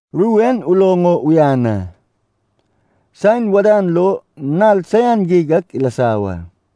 Ru en uloŋ o uyan a. Saen wadan lo nal saian geig ak ilasa wa.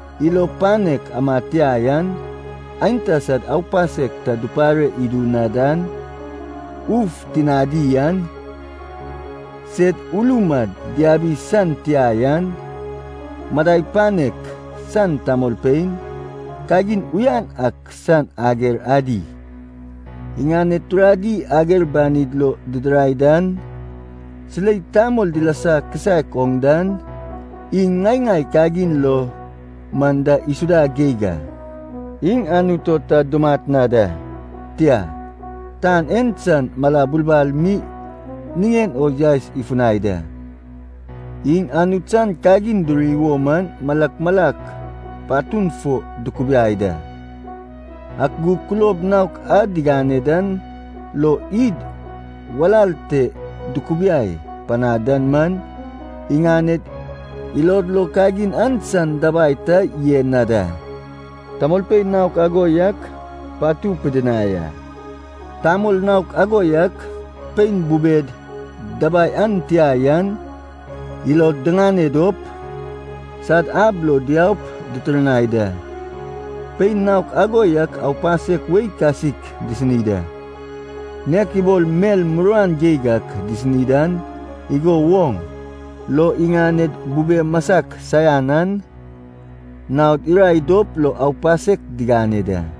ilo panek amad tia yan, aenta sad aupasek ta dupare idu na dan, uf tinadi an, sed ulum ad diabi san tia yan, madai panek san tamolpein, kagin uyan ak san ager adi, iŋaned turadi ager banin lo didirai dan, silei tamol dilasa kisaek oŋ dan, iŋ ŋai ŋai kagin lo man da isuda geig a. Iŋ Anut o ta dumat na da, tia, tan en san mala bulbal mi niŋen o yaes ifunai da. Iŋ Anut san kagin duri wo man malak malak patun fo dukubiai da, ak gug kulob naok a digane dan lo id walal te dukubiai panad dan man, iŋaned ilod lo kagin an san dabai ta yen na da. Tamolpein naok ago yak patu pidinai a. Tamol naok ago yak, pein bubed dabai an tia yan, ilod diŋane dop, sad ab lo diaup ditirnai da. Pein naok ago yak aupasek wei kasik disini da, nek ibol mel muruan geig ak disini dan igo woŋ lo iŋaned bube masak saian an naod irae dop lo aupasek digane da.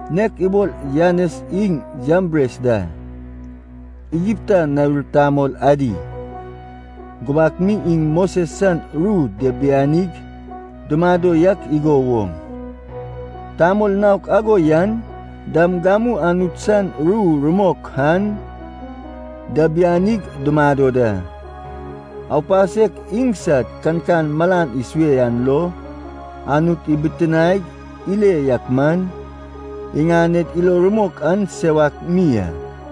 Nek ibol Janes iŋ Jambres da, Igipta nawir tamol adi, gubak mi iŋ Moses san ru diabianig dumado yak igo woŋ, tamol naok ago yan dam gamu Anut san ru rumok an diabianig dumado da. Aupasek iŋsad kankan malan isue an lo Anut ibitiniaig ile yak man, iŋaned ilo rumok an sewak mi a.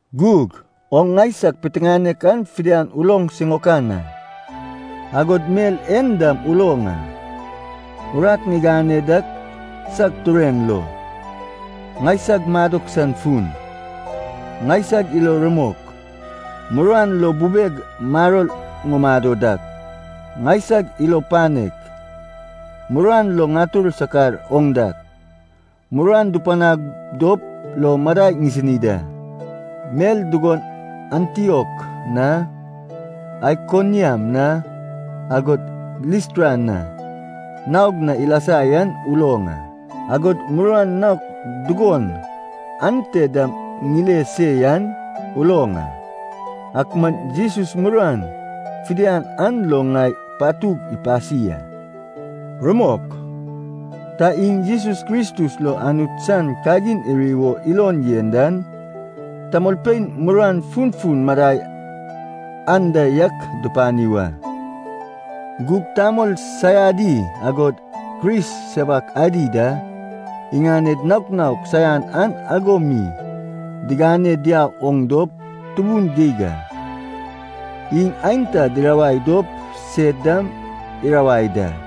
Gug oŋ ŋaisag piteŋanek an fidian uloŋ siŋaokan a. Agod mel en dam uloŋ a, urat ŋigane dak sag tureŋ lo, ŋaisag madok san fun, ŋaisag ilo rumok, muruan lo bubeg maror ŋumado dak, ŋaisag ilo panek, muruan lo ŋatur sakar oŋ dak, muruan dupanag dop lo madai ŋisini da. Mel dugon Antiok na, Aikoniam na, agod Listra na, naog na ilasa yan uloŋ a, agod muruan naok dugon ante dam ŋile se yan uloŋ a. Ak man Jesus muruan fidian an lo ŋai patug ipasi a. Rumok, ta iŋ Jesus Kristus lo Anut san kagin iri wo ilon yen dan, tamolpein muruan funfun madai anda yak dupani wa. Gug, tamol saiadi agod Kris sewak adi da iŋaned naok naok saian an ago mi digane diau oŋ dop tubun geig a. Iŋ aenta dirawai dop sed dam irawai da.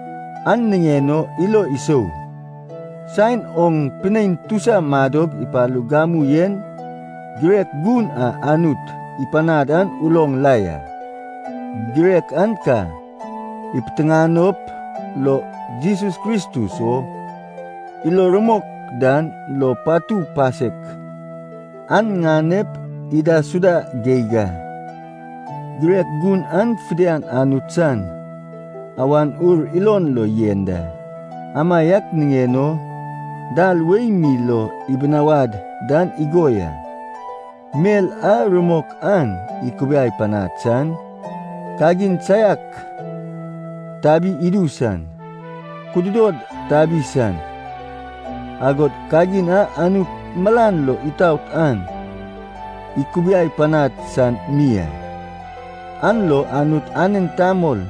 An niŋen o ilo isou, saen oŋ pinein tusa madog ipalug gamu en girek gun a Anut ipanad an uloŋ la ya. Girek an ka ipiteŋanop lo Jesus Kristus o ilo rumok dan lo patu pasek an ŋanep idaisuda geig a. Girek gun an fidian Anut san Awan Ur ilon lo yen da. Amaiak niŋen o, dal wei mi lo ibinawad dan igo ya, mel a rumok an ikubiai panad san, kagin saiak tabi idu san, kududod tabi san, agod kagin a Anut malan lo itaot an ikubiai panad san mi a. An lo Anut anen tamol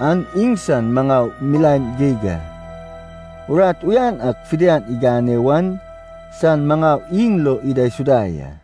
an iŋsan maŋau milaen geig a, urat uyan ak fidian igane wan san maŋau iŋ lo idaisuda ya.